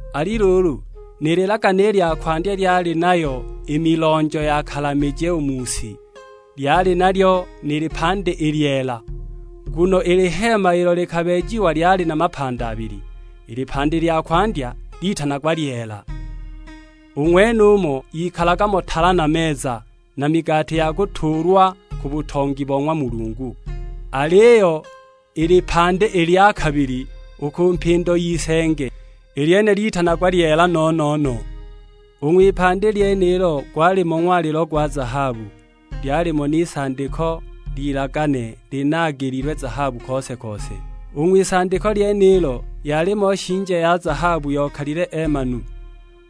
Ali luulu, ni lilagane i lya kwandya lyali nayo i milonjo ya kalamije u mu si; lyali nalyo ni lipandi i lyeela. Nguno i liheema ilo likabeejiwa lyali na mapandi abili, i lipandi i lya kwandya litanagwa lyeela. U ng'wenumo yikalaga mo tala na meza, na migati ya kutuulwa ku butongi bo ng'wa Mulungu. Aliyo i lipandi i lya kabili, u ku mpindo y'isenge, i lyene litanagwa lyeela no-no-no. U ng'wipandi lyenilo gwalimo ng'walilo gwa zahabu, lyalimo n'isandiko ly'ilagane linaagililwe zahabu kose-kose. U ng'wisandiko lyenilo yalimo shinje ya zahabu yokalile eemanu,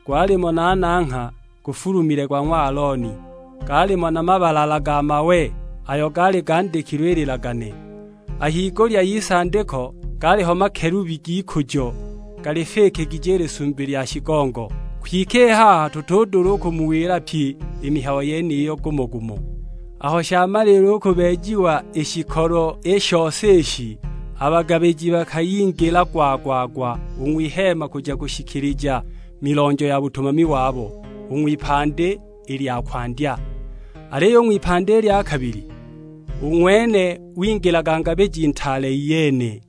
gwalimo na nangha gufulumile, gwa ng'wa Alooni, gaalimo na mabalala ga mawe ayo gaali gandikilwe i lilagane. A higulya y'isandiko gaaliho makelubi g'ikujo, galifikigije i Lisumbi lya shigongo. Kwike i haha tutudula u kumuwila pyi i mihayo yeniyo gumo-gumo. Aho shamaliila u kubeejiwa i shikolo i shose ishi, a bagabiji bakayingila gwa-gwa-gwa u ng'wiheema kuja kushikilija milonjo ya butumami wabo, u ng'wipandi i lya kwandya. Aliyo u ng'wipandi i lya kabili, u ng'wene wingilaga Ngabiji Ntaale iyene,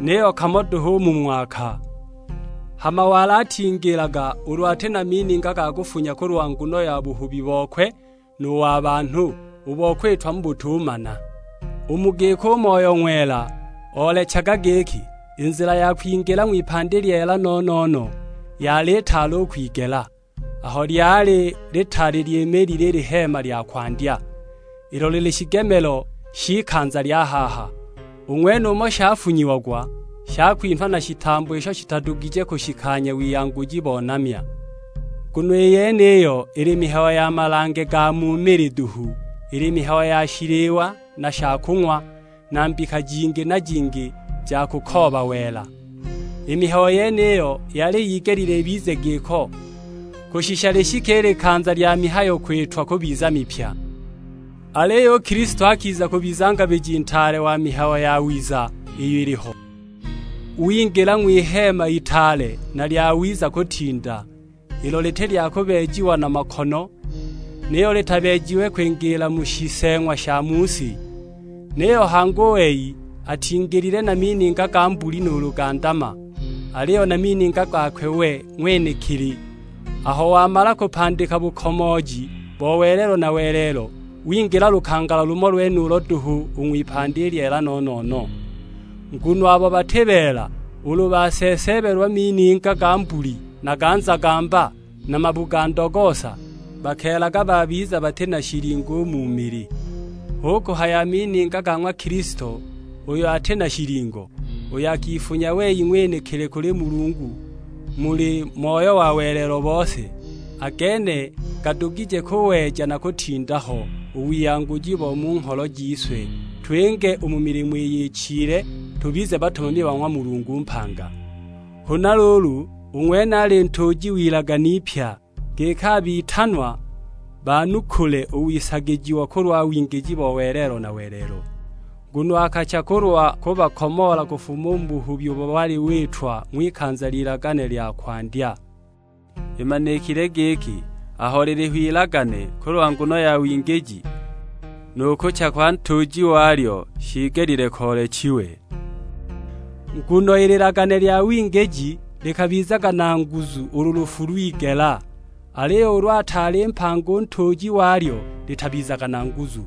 niyo kamo duhu u mu ng'waka; hama wali atingilaga ulu ati na mininga ga kufunya kulwa nguno ya buhubi bokwe nu wa banhu, u bo kwitwa mu butumana. U mu giko u Moyo Ng'wela oolechaga giki, i nzila ya kwingila ng'wipandi lyeela no-no-no yali itaali u kwigela; aho lyali litaali lyimiilile i liheema lya kwandya, ilo lili shigemelo sh'ikanza lya haha. U ng'wenumo shafunyiagwa shakwinha na shitambo isho shitadugije kushikanya wiyanguji bo namya. Nguno i yeniyo ili mihayo ya malange ga mu mili duhu; ili mihayo ya shiliwa na shakung'wa, na mbika jingi na jingi ja kukooba wela. I mihayo yeniyo yali yigelile ibize giko, kushisha lishike i likanza lya mihayo kwitwa kubiza mipya. Aliyo u Kilisto akiza kubiza Ngabiji Ntaale wa mihayo yawiza iyo iliho, wingila ng'wiheema itaale na lyawiza kutinda, ilo liti lya kubeejiwa na makono; niyo litabeejiwe kwingiila mu shiseeng'wa sha mu si. Niyo hangi u wei atingilile na mininga ga mbuli nuulu ga ndama, aliyo na mininga gakwe we ng'wenekili. Aho wamala kupandika bukomooji bo welelo na welelo, wingila lukangala lumo lwenulo duhu u ng'wipandi i lyeela no-no-no. Nguno abo bati beela ulu baseeseebelwa mininga ga mbuli na ga nzagamba, na mabu ga ndogoosa, bakeelaga babiza bati na shilingo u mu mili. Hu kuhaya a mininga ga ng'wa Kilisto uyo ati na shilingo, uyo akifunya wei ng'wenekili kuli Mulungu muli Moyo wa welelo bose, a gene gadugije kuweja na kutinda ho u wiyanguji bo mu ngholo jise twinge u mu milimo iyo ichile, tubize batumami ba ng'wa Mulungu mpanga! Huna luulu, u ng'wene ali Ntuuji w'ilagane ipya, giki a bitanwa banukule u wisagijiwa kulwa wingiji bo welelo na welelo; nguno akacha kulwa kubakomoola kufuma u mu buhubi ubo wali witwa ng'wikanza ly'ilagane lya kwandya. Imanikile giki, aho liliho ilagane kulwa nguno ya wingiji, nu kucha kwa ntuuji walyo shiigelile koolechiwe. Nguno i lilagane lya wingiji likabizaga na nguzu ulu lufu lwigela; aliyo ulu ataali mpanga u ntuuji walyo litabizaga na nguzu.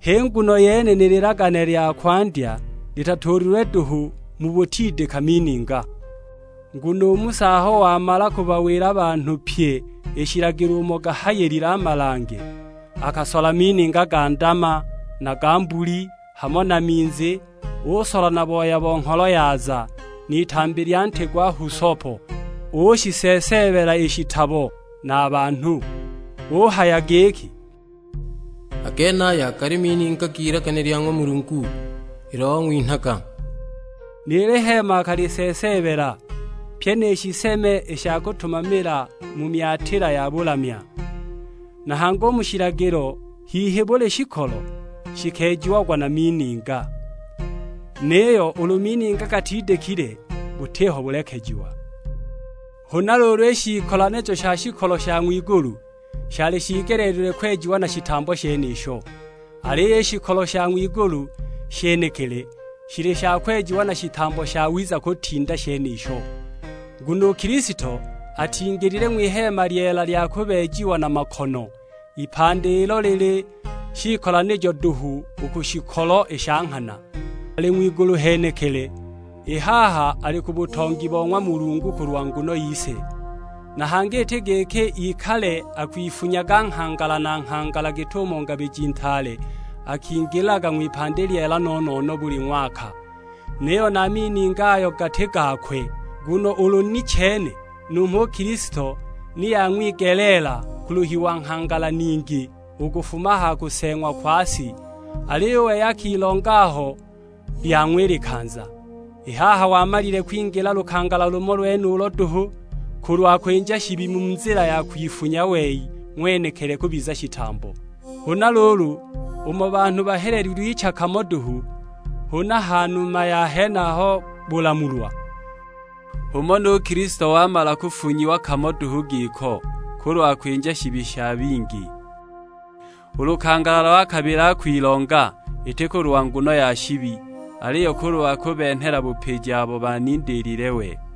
H'i nguno yene ni lilagane lya kwandya litatuulilwe duhu mu butidika mininga. Nguno u Musa aho wamala kubawila a banhu pyi i shilagilo umo gahayilile a malange, akasola mininga ga ndama na ga mbuli, hamo na minzi; usola na booya wa ngholo yaza, n'itambi lya nti gwa husopo, ushiseeseebela i shitabo, na a banhu. Uhaya giki, "A genaya gali mininga g'ilagane lya ng'wa Mulungu ilo wang'winhaga." Ni liheema akaliseeseebela, pyi ni shiseme i sha kutumamila mu myatila ya bulamya. Na hangi u mu shilagilo hihi buli shikolo shikeejiagwa na mininga, niyo ulu mininga gatidikile butiho bulekejiwa! Huna luulu, i shiikolanijo sha shikolo sha ng'wigulu shali shiigeleelilwe kwejiwa na shitambo shenisho, aliyo i shikolo sha ng'wigulu shenekili, shili sha kwejiwa na shitambo shawiza kutinda shenisho. Nguno u Kilisto atingilile ng'wiheema lyeela lya kubeejiwa na makono, ipandi ilo lili shiikolanijo duhu u ku shikolo i sha nghana. Ali ng'wigulu henekili, i haha ali ku butongi bo ng'wa Mulungu kulwa nguno yise. Na hangi iti giki ikale akwifunyaga nghangala na nghangala git'umo Ngabiji Ntaale akingilaga ng'wipandi lyeela no-no-no buli ng'waka, niyo na mininga ayo gati gakwe. Nguno ulu ni chene, numho u Kilisto ni yang'wigeleela kuluhiwa nghangala ningi u kufuma a ha kuseeng'wa kwa si; aliyo u wei akilonga aho lyang'wa i likanza. I haha wamalile kwingila lukangala lumo lwenulo duhu, kulwa kwinja shibi mu nzila ya kwifunya wei ng'wenekili kubiza shitambo. Huna luulu, umo banhu bahelelilwe icha kamo duhu, huna a ha numa ya henaho bulamulwa, h'umo nu Kilisto wamala kufunyiwa kamo duhu giko, kulwa kwinja shibi sha bingi. U lukangala lwa kabili akwilonga, iti kulwa nguno ya shibi; aliyo kulwa kubenhela bupiji abo banindiilile we.